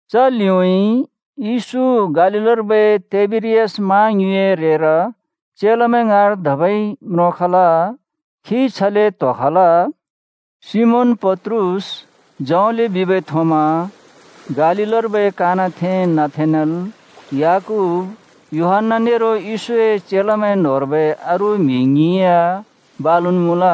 च लिउँइँ येशू गलिलर्बै तिबेरियास मा ङ्युँइए रेर चेलामैं ङाँर धबै म्रोंखल। खी छले त्होखल: सिमोन पत्रुस, जौंले बिबै थोमा, गालीलर्बै कानाथें नथानेल, याकूब, यूहन्‍ना, नेरो येशूए चेलामैं न्होंर्बै अरू म्हि ङ्हिं या बालुन् मुँल।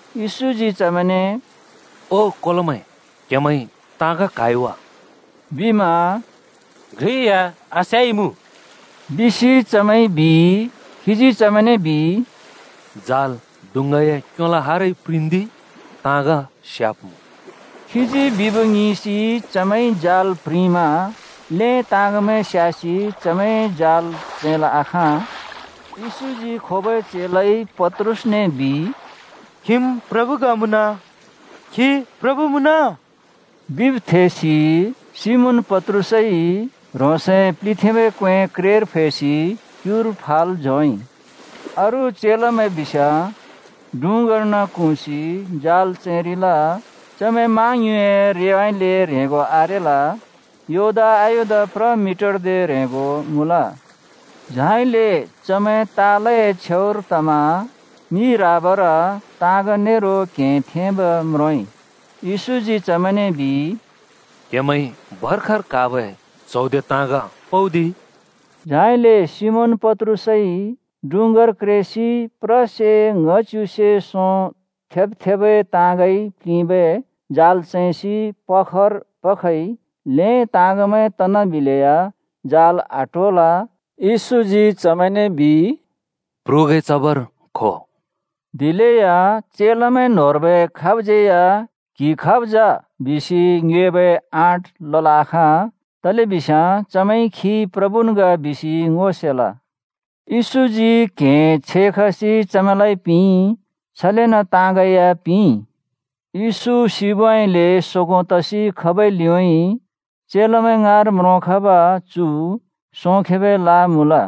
येशूजी चमैंने “ओ कोलोमैं, क्हेमैंइ ताँग क्हाइ वा?” बिमा “घ्रि या आस्याइमुँ!” बिसि चमैंइ बिइ। खीजी चमैंने बिइ, “जाल डुँङ्गाए क्योलो हारइ प्रिंन्दि ताँग स्याब्मुँ।” खीजी बिब् ङिंसि चमैंइ जाल प्रिंमा ल्हें ताँगमैं स्यासि चमैंइ जाल चैंल् आखाँ। येशूजी खोबै चेलाइ पत्रुसने बिइ, “खिम् प्रभु ग मुँन!” “खी प्रभु मुँन!” बिब् थेसि सिमोन पत्रुसइ ह्रोंसए प्लिथेंबै क्वें क्रेर फैसि क्युर फाल् झोंइ। अरू चेलामैं बिस्याँ डुँङ्गार्न क्हुँसि जाल चैंरिल। चमैं माँङ्युँइए रेउँइँले ह्रेंगो आरेल। योदा आयोदा प्र मिटरदे ह्रेंगो मुँल। झाइले चमैं तालए छेउर तमा मि राबार ताँग नेरो क्हें थेंब म्रोंइ। येशूजी चमैंने बिइ, “क्‍हेमैंइ भर्खर क्‍हाबै च्हौदे ताँग पउदि।” झाइले सिमोन पत्रुसइ डुँङ्गार क्रेसि प्रसे ङ्‌हच्युसे सों थेब्-थेबै ताँगइ प्लिंबै जाल चैंसि पखर पखइ। ल्हें ताँगमैं तनाबिलेया जाल आट्होल। येशूजी चमैंने “प्रुगैं चबर खो बिइ।” दिलेया चेलामैं न्होंर्बै खाबज्यै या “क्हि खाब् जा?” बिसि ङ्योएबै आँट लल् आखाँ। तलेबिस्याँ चमैंइ खी प्रभुन् ग बिसि ङो सेल। येशूजी क्हें छेखसि चमैंलाइ पिंइ, छलेन ताँगै या पिंइ। येशू सिबउँइँले सोगों तसि खबै लिउँइँ चेलामैं ङाँर म्रोंखब चु सोंखेबै ला मुँल।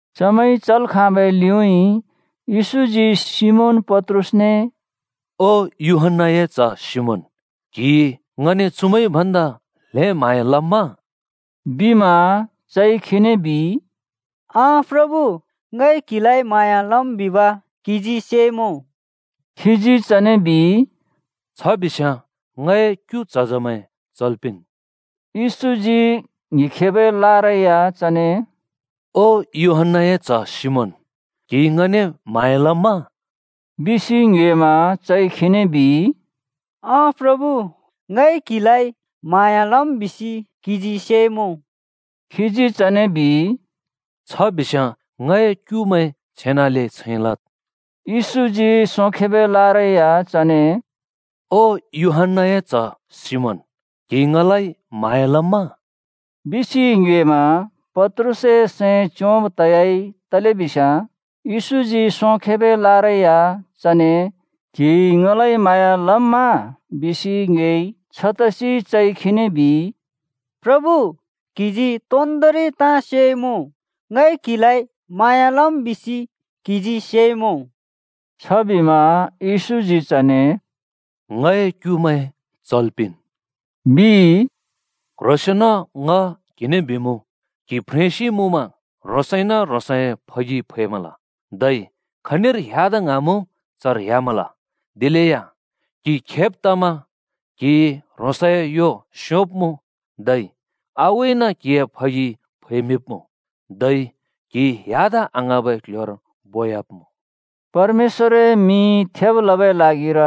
चमैंइ चल् खाँबै लिउँइँ येशूजी सिमोन पत्रुसने “ओ यूहन्‍नाए च्ह सिमोन, क्हिइ ङने चुमैंइ भन्दा ल्हें म्हाँया लम्मा?” बिमा चइ खीने बिइ, “अँ प्रभु, ङइ क्हिलाइ म्हाँया लम् बिब क्हिजी सेइमुँ।” खीजी चने बिइ, “छ बिस्याँ ङए क्यु झजमैं चल् पिंन्।” येशूजी ङ्हिखेबै लारै या चने “ओ यूहन्‍नाए च्ह सिमोन, क्हिइ ङने म्हाँया लम्मा?” बिसि ङ्योएमा चइ खीने बिइ, “अँ प्रभु, ङइ क्हिलाइ म्हाँया लम् बिसि क्हिजी सेइमुँ।” खीजी चने बिइ, “छ बिस्याँ ङए क्युमैं छेनाले छैं लद्।” येशूजी सोंखेबै लारै या चने “ओ यूहन्‍नाए च्ह सिमोन, क्हिइ ङलाइ म्हाँया लम्मा?” बिसि ङ्योएमा पत्रुसए सैं च्योंब तयाइ तलेबिस्याँ येशूजी सोंखेबै लारै या चने “क्हिइ ङलाइ म्हाँया लम्मा?” बिसि ङ्योएइ। छतसि चइ खीने बिइ, “प्रभु, क्हिजी तोन्दोंरि ताँ सेइमुँ। ङइ क्हिलाइ म्हाँया लम् बिसि क्हिजी सेइमुँ।” छबिमा येशूजी चने “ङए क्युमैं चल् पिंन्,” बिइ। “क्ह्रोंसेंन ङ क्हिने बिमुँ, क्हि फ्रेंसि मुँमा ह्रोंसइन ह्रोंसए फगि फैमल, धै खनिर ह्‍यादा ङ्हाँमुँ चर ह्‍यामल। दिलेया क्हि खेब् तमा क्हिइ ह्रोंसए यो स्योंब्मुँ, धै आगुइन क्हिए फगि फैमिंब्मुँ। धै क्हि ह्‍यादा आङ्हाँबै क्ल्ह्‍योर बो‍याब्मुँ।” (परमेश्‍वरए मिं थेब् लबै ल्हागिर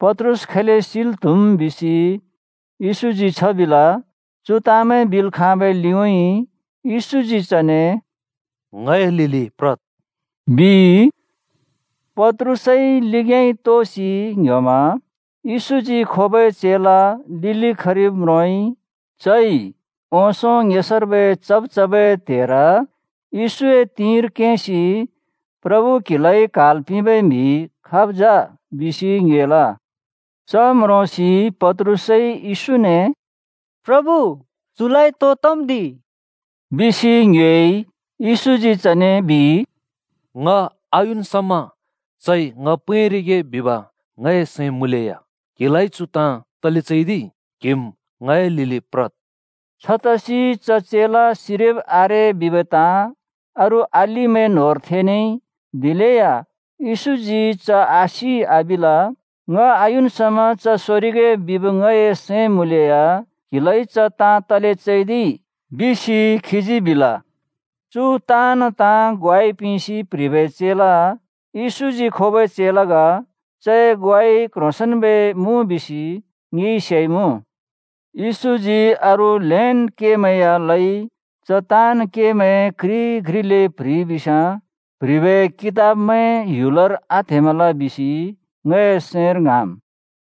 पत्रुस खैले सिल् त्‍हुम् बिसि येशूजी छ बिल।) चु ताँमैं बिल् खाँबै लिउँइँ येशूजी चने “ङए लिलि प्रद्!” बिइ। पत्रुसइ लिग्‍याँइ तोसि ङ्‌ह्‍योमा येशूजी खोबै चेला लिलि खरिब् म्रोंइ। चइ ओंसों ङेसर्बै चब् चबै त्हेर येशूए तिंर केंसि “प्रभु, क्हिलाइ क्हाल् पिबै म्हि खाब् जा?” बिसि ङ्योएल। च म्रोंसि पत्रुसइ येशूने “प्रभु, चुलाइ तो तम् दि?” बिसि ङ्योएइ। येशूजी चने बिइ, “ङ आयुन् समा चइ ङ पैंरिगे बिब ङए सैं मुँलेया क्हिलाइ चु ताँ तले चैदिइ? क्हिम् ङए लिलि प्रद्!” छतसि च चेला सिरिब आरे बिबै ताँ अरू अलिमैं न्होंर थेनेइ। दिलेया येशूजी “च आसि” आबिल। “ङ आयुन् समा च सोरिगे बिब ङए सैं मुँलेया क्‍हिलाइ च ताँ तले चैदिइ?” बिसि खीजी बिल। चु ताँन् ताँ ग्वाइ पिंसि प्ह्रिबै चेला येशूजी खोबै चेला ग। चए ग्वाइ क्ह्रोंसेंन्बै मुँ बिसि ङिइ सेइमुँ। येशूजी अरू ल्हेंन् केमैं या लइ। च ताँन् केमैं घ्रि घ्रिले प्ह्रिइ बिस्याँ प्ह्रिबै कितबमैं ह्‍युलर आत्हेमल बिसि ङए सैंर ङ्हाँम्।